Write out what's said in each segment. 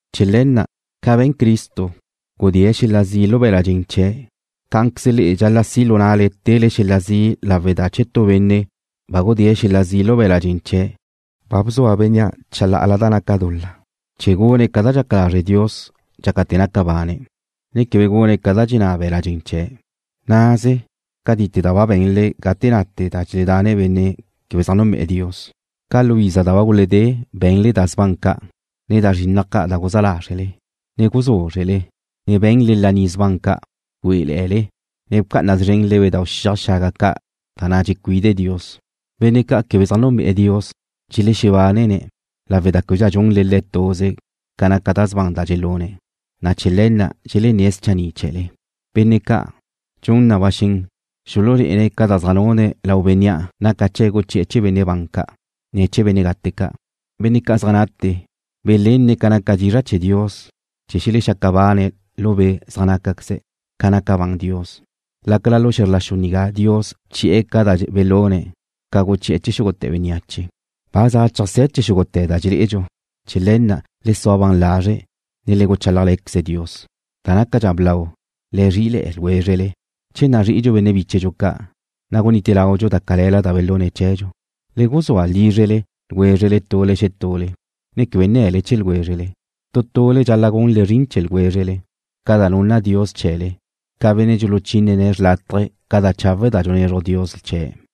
Chee̱ le̱ na', ca be̱n Cristo, gudée̱' xel-la' zi' lu be̱la' dxen chee̱', cá'anqueze le'e dxal-la' si lu nale tele xel-la' zi' lawe' da che tu benne' ba gudée̱' xel-la' zi' lu be̱la' dxen chee̱', ba bzua bénnea' chalá'ala da naca dul-la, chee̱ gune̱' ca da dxaca lazre' Dios dxácate̱ naca bane̱', ne quebe gune̱' ca da dxenná be̱la' dxen chee̱'. Naze cátite da ba be̱nle gate nate da dxeledanne benne' quebe zaj núnbe'e̱ Dios. Ca lu iza da ba guledé be̱nle da sban ca', ne da zrinnaj ca' da guzá lázrele, ne guzúzrele, ne be̱nle laní sban ca'. Güé'ele̱'e̱le, ne bca'ana szrenle bedau' xiaj xaga ca' da na' dxecuide Dios. Benne' ca' quebe zaj núnbe'e̱ Dios dxelexebánene̱' lawe' da québedxa dxunle le̱' tuze ca naca da sban da dxelune̱', na' chee̱ le̱ na' dxelenné̱' schanni' chee̱le. Benne' ca', dxun na ba xen xululé'ene̱' ca da zaj nune̱' lau Bénnea' naca chee̱' guchi'e̱ chee̱ benne' ban ca', ne chee̱ benne' gate ca'. Benne' ca' zaj nate belenne̱' ca naca dizra' chee̱ Dios chee̱ xelexaca bane̱' lu be' zaj nácaqueze' ca naca ban Dios, lácala lu xe̱zr la xu nigá Dios bchi'e̱ ca da belune̱' ca guchi'e̱ chee̱ xúgute̱ bénneache. Ba za cheajsé̱ chee̱ xúgute̱ da dxelé'edxu. Chee̱ le̱ na', le sua ban lazre', ne le guchálajle̱queze Dios. Da nácadxa blau, le zrí'ile̱'e̱ ljwézrele. Che nazrí'idxu benne' bíchedxu ca', na' gunite laudxu da calela da belune̱' chee̱dxu. Le guzúa lízrele ljwézrele tule xetule, ne quebe nne̱le chee̱ ljwézrele. Tu tule le'e dxal-la' gunle zrin chee̱ ljwézrele ca da nunna Dios chee̱le, ca benne' dxuluchínene̱' chawe' ca da chawe' da dxunezruj Dios chee̱'.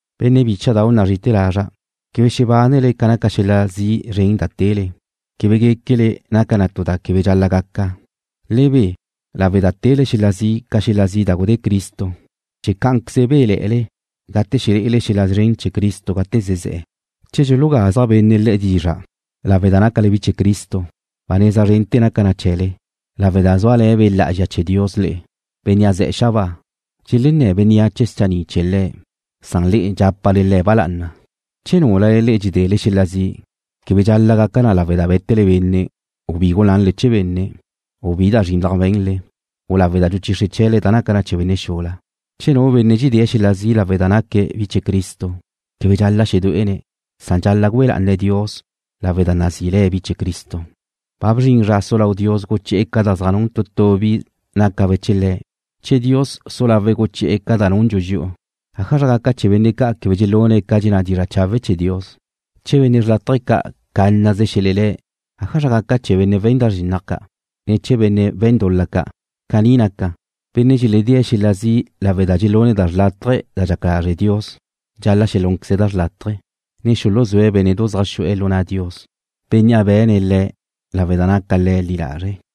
Benne' bícha'dau' nazri'ite̱ lazra', quebe xebánele ca naca xel-la' zi' zren da tele, quebe guéquele naca na tu da quebe dxal-la' gaca. Le be lawe' da tele xel-la' zi' ca xel-la' zi' da gudé Cristo chee̱ cá'anqueze béle̱'e̱le gate lé'ele xel-la' szren chee̱ Cristo gate zezé̱'e̱. Che dxulugazja' benne' le'e dizra' lawe' da nácale bi chee̱ Cristo, ba neza zren naca na chee̱le, lawe' da zúale̱ Be' Lá'azxa chee̱ Dios le'e, Bénnea' ze̱'e̱ xabáa. Dxelenné̱ bénneache schanni' chee̱ Le̱', san le'e dxápale Le̱' ba lá'ana. Che núlale le'e dxedele xel-la' zi', quebe dxal-la' gaca na lawe' da bé̱tele benne', u bi gulanle chee̱ benne', u bi da zrinnaj be̱nle, u lawe' da guchixre chee̱le da naca chee̱ benne' xula. Che nu benne' dxedée̱' xel-la' zi' lawe' da naque̱' bi chee̱ Cristo, quebe dxal-la' xedué'ene̱', san dxal-la' güe lá'ane̱' Dios lawe' da nazí le̱' bi chee̱ Cristo. Ba bzrin zra su lau Dios guchi'e̱ ca da zaj nun tu tu bi nácabe' chee̱ Le̱'. Che Dios su lawe̱' guchi'e̱ ca da nundxu dxi'u, ¿ájala gaca chee̱ benne' ca' quebe dxelune̱' ca dxenná dizra' chawe' chee̱ Dios? Che benne' xrlátaje ca' cánnaze xelelé̱' ¿ájazraqueze gaca chee̱ benne' we̱n da zrinnaj ca', ne chee̱ benne' we̱n dul-la ca'? Caní naca, benne' dxeledée̱' xel-la' zi' lawe' da dxelune̱' da xrlátaje da dxaca lazre' Dios, dxal-la' xelúnqueze̱' da xrlátaje, ne xuluzúe̱' bénne'du zaj xu'e̱ lu na' Dios, Bénnea' be̱ne̱' le', lawe' da naca Le̱' li lazre'.